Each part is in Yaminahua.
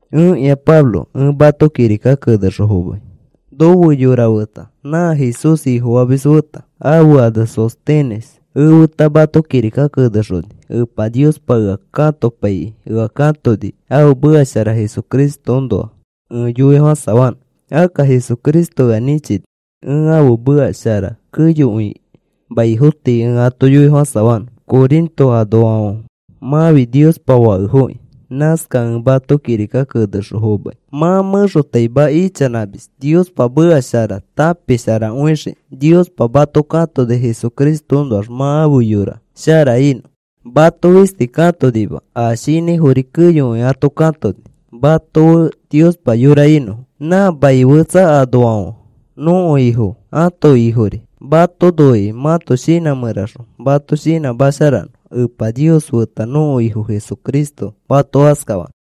Ẽkĩa Pablo, ẽ mato kirika kenexõ fomai. Nofe yora feta nã Jesús Ifofamis feta, ãfe ane Sóstenes, efeta mato kirika kenexoni. Epa Niospa ea katopaikĩ ea katoni ãfe meka shara Jesucristoõnoa ẽ yoifofãsafanõ. Akka Jesucristo ea nĩchini ẽ ãfe meka shara keyokõi maifo tii ẽ ato yoifofãsafanõ. Corinto anoafãfe mãfi Niospa fakefoki. Nãskakẽ ẽ mato kirika kenexõ fomai. Mã mẽxotaima ichanãmis Niospa meka shara tãpisharakõixikĩ. Niospa mato katoni Jesucristoõnoax mã afe yora shara inõ. Mato fisti katonima, a shinãifori keyokõi ato katoni mato fe Niospa yora inõfo. Nã mai fetsa anoafãfe nõko Ifo ãto Ifori. Mato noikĩ mãto shinã mẽraxõ mato shinãmasharanõ. Epa Nios feta nõko Ifo Jesucristo mato askafanõ.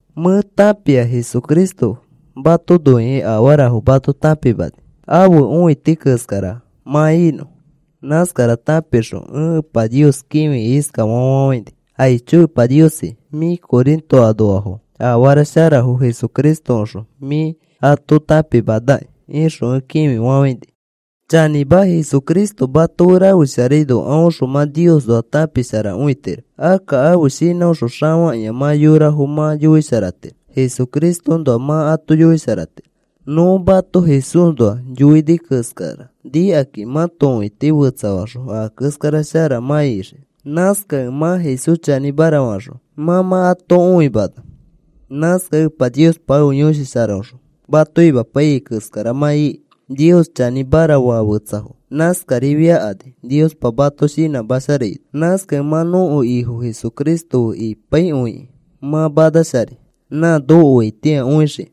Mẽ tãpia Jesucristo mato noikĩ afarafo mato tãpimani ãfe õiti keskara mã inõ. Nãskara tãpixõ ẽ Epa Nios kĩfikĩ iskafa fafafãini: “Aicho Epa Niosi, mĩ Corinto anoafo afara sharafo Jesucristoõxõ mĩ ato tãpimanaki,” ixõ ẽ kĩfifafãini. Chanĩma, Jesucristo mato fe rafesharaino aõxõ mã Niosnoa tãpisharakõitiro. Akka ãfe shinãõxõ xafakĩa mã yorafo mã yoisharatiro. Jesucristoõnoa mã ato yoisharatiro. Nõ mato Jesúsnoa yoini keskara nikakĩ mãto õiti fetsafaxõ a keskara shara mã ixii. Nãskakẽ mã Jesús chanĩmara faxõ mã mã ato õimana. Nãskakẽ Epa Niospa ãfe Yõshi Sharaõxõ mato imapaiyai keskara mã iki. Nios chanĩmara faa fetsafo nãskarifiakani Niospa mato shinãmasharaino. Nãskakẽ mã nõko Ifo Jesucristo fe ipaikõikĩ mã manasharai nã nokoaitĩa õixikĩ.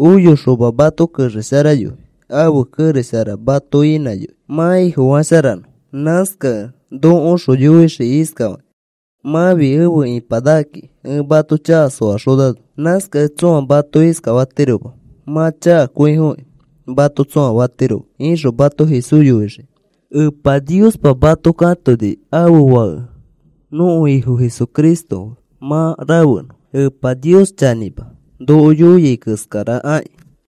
Oyoxoma mato kexesharayoi. Ãfe kerex shara mato inãyoi mã Ifofasharano. Nãskakẽ nokoõxõ yoixii iskafakĩ: “Mãfi efe ipanakaki, ẽ mato chaka soaxonano. Nãskakẽ tsõa mato iskafatiroma: ‘Mã chakakõifoki,’ mato tsõa fatirofoma,” ixõ mato Jesús yoixii. Epa Niospa mato katoni ãfe Fake nõko Ifo Jesucristo fe mã rafenõ. Epa Nios chanĩma, noko yoiai keskara aki.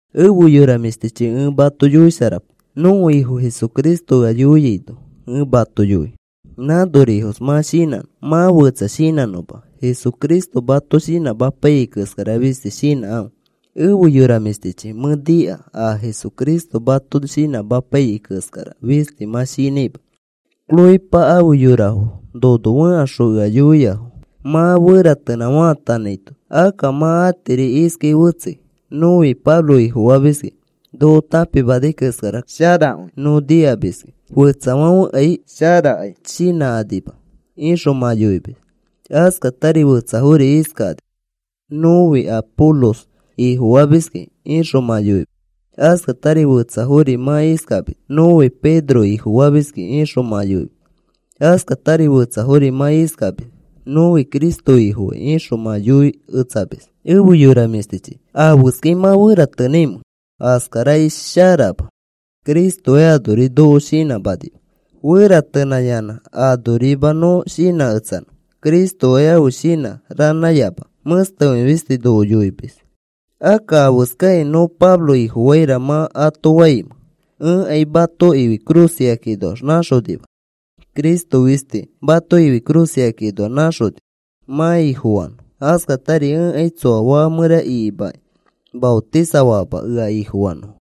Efe yora mĩshtichi, ẽ mato yoisharapai. Nõko Ifo Jesucristo ea yoiaino ẽ mato yoi nãnorifos mã shinãnõ, mã fetsa shinãnõma. Jesucristo mato shinãmapaiyai keskara fisti shinãkãfe. Efe yora mĩshtichi, mẽ nika a Jesucristo mato shinãmapaiyai keskara fisti mã shinãima. Cloépa afe yorafo nono fẽkaxõ ea yoiafo mã feratenã faatanãito. Akka mã atiri iskai fetsei: “Nõfi Pablo ifofamiski. Noko tãpimanai keskara kayakaikõi nõ nikamis. Fetsafãfekai kayakai shinãkanima,” ixõ mã yoimis. Askatari fetsafori iskakani: “Nõfi Apolos ifofamiski,” ixõ mã yoimis. Askatari fetsafori mã iskamis: “Nõfi Pedro ifofamiski,” ixõ mã yoimis. Askatari fetsafori mã iskamis: “Nõfi Cristo Ifofai,” ixõ mã yoiketsamis. Efe yora mĩshtichi, ¿afeskai mã feratenãimẽ? Askarakai sharama. Cristokai anori noko shinãmanima feratenãyanã anorima nõ shinãketsanõ. Cristokai ãfe shinã ranãyama. Mẽstekõi fisti noko yoimis. Akka, ¿afeskakĩ “Nõ Pablo ifofaira” mã ato faimẽ? Ẽkai mato ifi cruz ikakĩnoax nãxonima. Cristo fistichi mato ifi cruz ikakĩnoax nãxoni mã Ifofanõ. Askatari ẽkai tsoa faka mẽra ikimakĩ maotisafama ea ifofanõfo.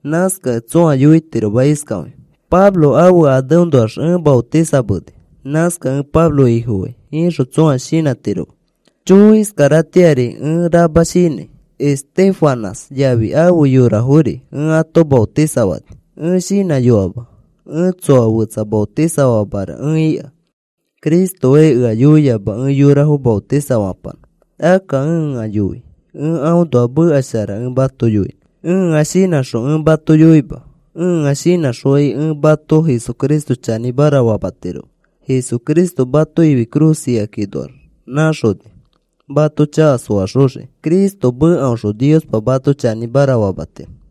Nãskakẽ tsõa yoitiroma iskafakĩ: “Pablo ãfe aneõnoax ẽ maotisameni. Nãskakẽ ẽ Pablo ifofai,” ixõ tsõa shinãtiroma. Chõõ, iskaratĩari ẽ rama shinãi. Estéfanas yafi afe yorafori ẽ ato maotisafani. Ẽ shinãyoama ẽ tsoa fetsa maotisafamara ẽ ika. Cristokai ea yoiama ẽ yorafo maotisafapanõ. Akka ea yoia ẽ aõnoa meka shara ẽ mato yoinõ. Ẽa shinãxõ ẽ mato yoima. Ẽa shinãxokai ẽ mato Jesucristo chanĩmara famatiroma. Jesucristo mato ifi cruz ikakĩnoax nãxoni mato chaka soaxoxikĩ. Cristo mekaõxõ Niospa mato chanĩmara famatiro.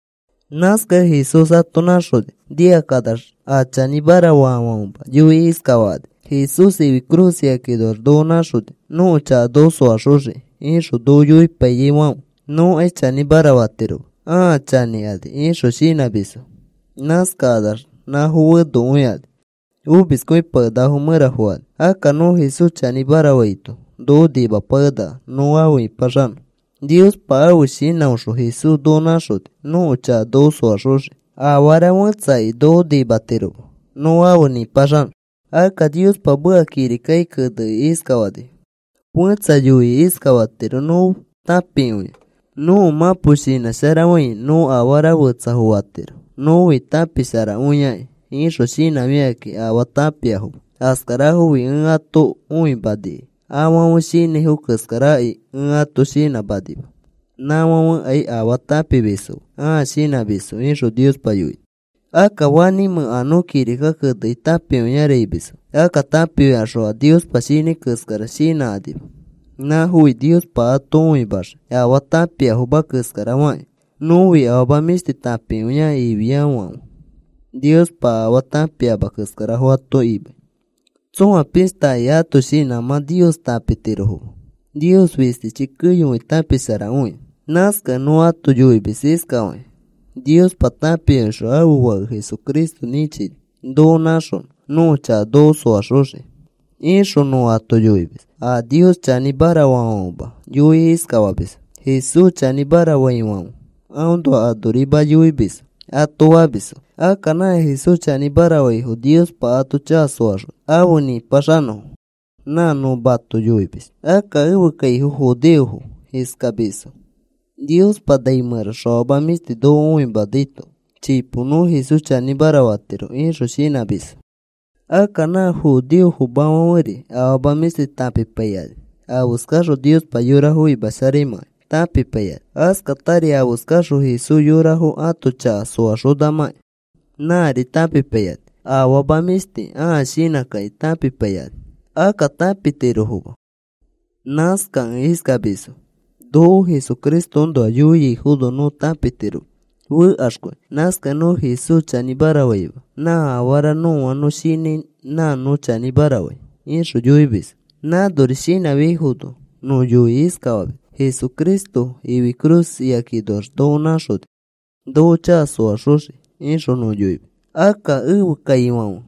Nãskakẽ Jesús ato nãxoni nikakanax a chanĩmara faafãfema yoikĩ iskafakani: “Jesús ifi cruz ikakinoax noko nãxoni nõko chaka noko soaxoxikĩ, ixõ noko yoipaiyaifãfe nõkai chanĩmara fatiroma. Ãa chanĩkani,” ixõ shinãmisfo. Nãskakanax nãfo fenokõikani. Omiskõipakenakafo mẽra fokani. Akka nõ Jesús chanĩmara faito noko nimapakenaka nõ afe ĩpaxanõ. Niospa ãfe shinãõxõ Jesús noko nãxoni nõko chaka noko soaxoxiki. Afara fẽtsakai noko nimatiroma nõ afe nĩpaxanõ. Akka Niospa meka kirikaki kenekĩ iskafanifo: Fẽtsa yoikĩ iskafatiro: “Nõ tãpikõia. Nõko mãpo shinãsharafãi nõ afara fetsafo fatiro nõfi tãpisharakõiakĩ,” ixõ shinãfikakĩ afaa tãpiafoma. Askarafofi ẽ ato õimanikai afãfe shinãifo keskarakai ẽ ato shinãmanima. Nãfãfekai afaa tãpimisfoma. Ãa shinãmisfo, ixõ Niospa yoini. Akka, ¿fanĩmẽ a nõ kirika kenekĩ tãpiakõiara imisfo? Akka tãpifikaxõ a Niospa shinãi keskara shinãkanima. Nãfofi Niospa ato õimaxii afaa tãpiafoma keskara fakĩ. “Nõfi afama mĩshti tãpikõiaki,” ifiaifãfe Niospa afaa tãpiama keskarafo ato imai. Tsõa pishtakai ãto shinãmã Nios tãpitirofoma. Nios fistichi keyokõi tãpisharakõia. Nãskakẽ nõ ato yoimis iskafakĩ: “Niospa tãpikõixõ ãfe Fake Jesucristo nĩchini noko nãxonõ nõko chaka noko soaxoxikĩ,” ixõ nõ ato yoimis. A Nios chanĩmara faafãfema yoikĩ iskafamisfo: “Jesús chanĩmara faifãfe aõnoa anorima yoimisfo,” ato famisfo. Akka nã Jesús chanĩmara faifo Niospa ato chaka soaxoni afe nipaxanõfo. Nã nõ mato yoimis. Akka ẽfe kaifo judeofo iskamisfo: “Niospa nai mẽraxõ afama mĩshti noko õimanaito chipo nõ Jesús chanĩmara fatiro,” ixõ shinãmisfo. Akka nã judeofomafãferi afama mĩshti tãpipaikani. Afeskaxõ Niospa yorafo imasharaimãkai tãpipaikani. Askatari afeskaxõ Jesús yorafo ãto chaka soaxonamãkĩ nãri tãpipaikani. Afama mĩshti ãa shinãkakĩ tãpipaikani. Akka tãpitirofoma. Nãskakẽ iskamisfo: “Noko Jesucristoõnoa yoiaifono nõ tãpitiroma, fekaxkõi. Nãskakẽ nõ Jesús chanĩmara faima. Nã afara nõa nõ shinãi nã nõ chanĩmara fai,” ixõ yoimisfo. Nãnori shinãfiaifono nõ yoikĩ iskafamis: “Jesucristo ifi cruz ikakinoax noko nãxoni noko chaka soaxoxikĩ,” ixõ nõ yoimis. Akka ẽfe kaifãfe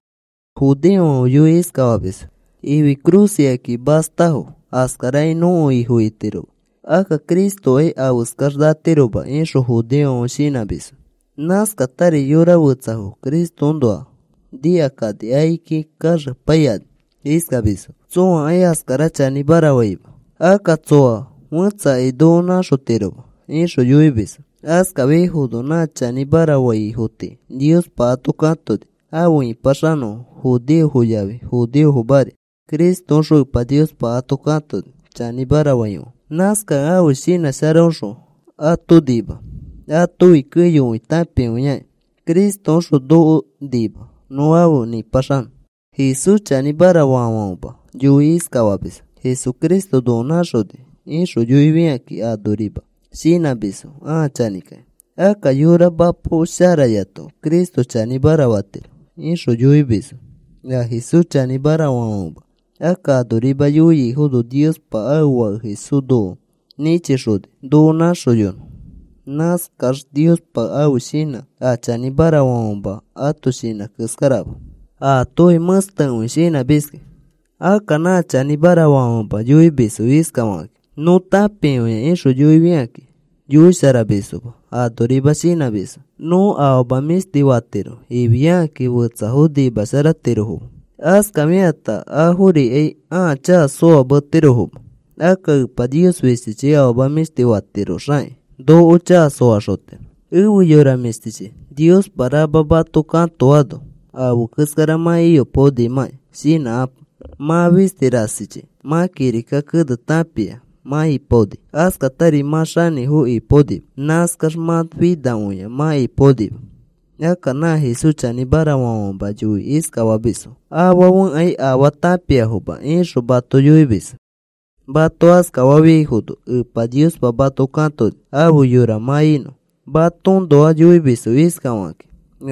judeofãfe yoikĩ iskafamisfo: “Ifi cruz ikakĩ mastafo askarakai nõko Ifo itiroma. Akka Cristokai afeskax natiroma,” ixõ judeofãfe shinãmisfo. Nãskatari yora fetsafo Cristoõnoa nikakani akiki kaxepaikani iskamisfo: “Tsõakai askara chanĩmara faima. Akka tsoa fẽtsakai noko nãxotiroma,” ixõ yoimisfo. Askafiaifono nã chanĩmara faifo tii Niospa ato katoni afe ipaxanõfo. Judeofo yafi judeofomari Cristoõxõ Epa Niospa ato katoni chanĩmara faifãfe. Nãskakẽ ãfe shinã sharaõxõ ato nima. Atofi keyokõi tãpikõiaki Cristoõxõ noko nima nõ afe nipaxanõ. Jesús chanĩmara faafãfema yoikĩ iskafamisfo: “Jesucristo noko nãxoni,” ixõ yoifikakĩ anorima shinãmisfo, ãa chanĩkakĩ. “Akka yora mapo sharayato Cristo chanĩmara fatiro,” ixõ yoimisfo a Jesús chanĩmara faafãfema. Akka anorima yoifiafono Niospa ãfe Fake Jesús noko nĩchixoni noko nãxoyonõ. Nãskax Niospa ãfe shinã a chanĩmara faafãfema ãto shinã keskarama. Aatofi mẽstekõi shinãmis. Akka nã chanĩmara faafãfema yoimisfo iskafakakĩ: “Nõ tãpikõia,” ixõ yoifikakĩ yoisharamisfoma. Anorima shinãmisfo. “Nõ afama mĩshti fatiro,” ifiakakĩ fetsafo nimasharatirofoma. Askafikata aforikai ãa chaka soametirofoma. Akka Epa Nios fistichi afama mĩshti fatiroxakĩ noko chaka soaxotiro. Efe yora mĩshtichi, Niospa rama mato katoano afe keskara mã iyopaonimãki. Shinãkapo. Mã fisti rasichi mã kirika kene tãpia mã ipaoni. Askatari mã xanĩfo ipaonima. Nãskax mã finakõia mã ipaonima. Akka nã Jesús chanĩmara faafãfema yoikĩ iskafamisfo: “Afãfekai afaa tãpiafoma,” ixõ mato yoimisfo. Mato askafafiaifono Epa Niospa mato katoni afe yora mã inõ. Matoõnoa yoimisfo iskafakakĩ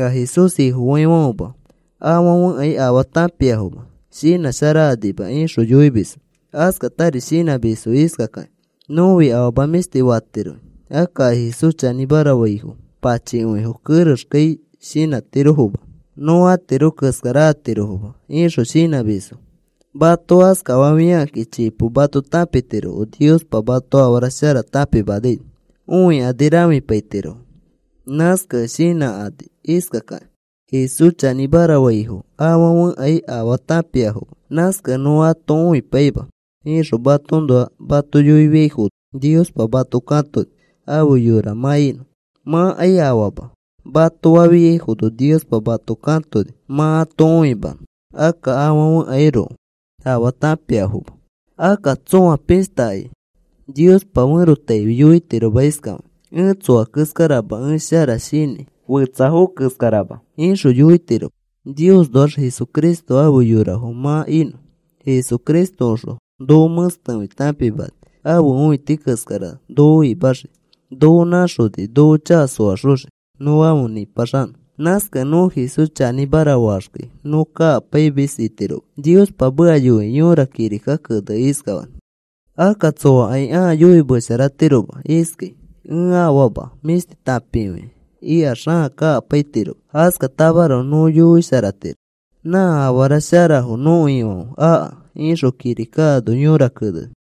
a Jesús Ifofaifãfema: “Afãfekai afaa tãpiafoma. Shinãsharakanima,” ixõ yoimisfo. Askatari shinãmisfo iskakakĩ: “Nõfi afama mĩshti fatiroki. Akka a Jesús chanĩmara faifo pachikõifo, kerexkai shinãtirofoma. Nõ atiro keskara atirofoma,” ixõ shinãmisfo. Mato askafafiakakĩ chipo mato tãpitirofo. Niospa mato afara shara tãpimanaino õikani rãfipaitirofo. Nãskakẽ shinãkani iskakakĩ: “Jesús chanĩmara faifo afãfekai afaa tãpiafoma. Nãskakẽ nõ ato õipaima,” ixõ matoõnoa mato yoifiaifono Niospa mato katoni afe yora mã inõ. “Mãkai afaama,” mato fafiaifono Niospa mato katoni mã ato õimanõ akka afãfekairoko afaa tãpiafoma. Akka tsõa pishtakai Niospa ferotaifi yoitiroma iskafakĩ: “Ẽ tsoa keskarama. Ẽ shara shinãi fetsafo keskarama,” ixõ yoitiroma. Niosnoax Jesucristo afe yorafo mã inõ. Jesucristoõxõ noko mẽstekõi tãpimani ãfe õiti keskara noko imaxii. Noko nãxoni noko chaka soaxoxiki nõ afe nĩpaxanõ. Nãskakẽ nõ Jesús chanĩmara faaxkai nõ kakapaimis itiroma. Niospa meka yoikĩ yõra kirika keneni iskafakĩ: “Akka tsoakai ãa yoimesharatiroma iskai: ‘Ẽ afama mĩshti tãpikõia,’ ikax ãa kakapaitiroma. Askatamaroko nõ yoisharatiro nã afara sharafo nõko Ifãfe aka,” ixõ kirika ano yõra keneni.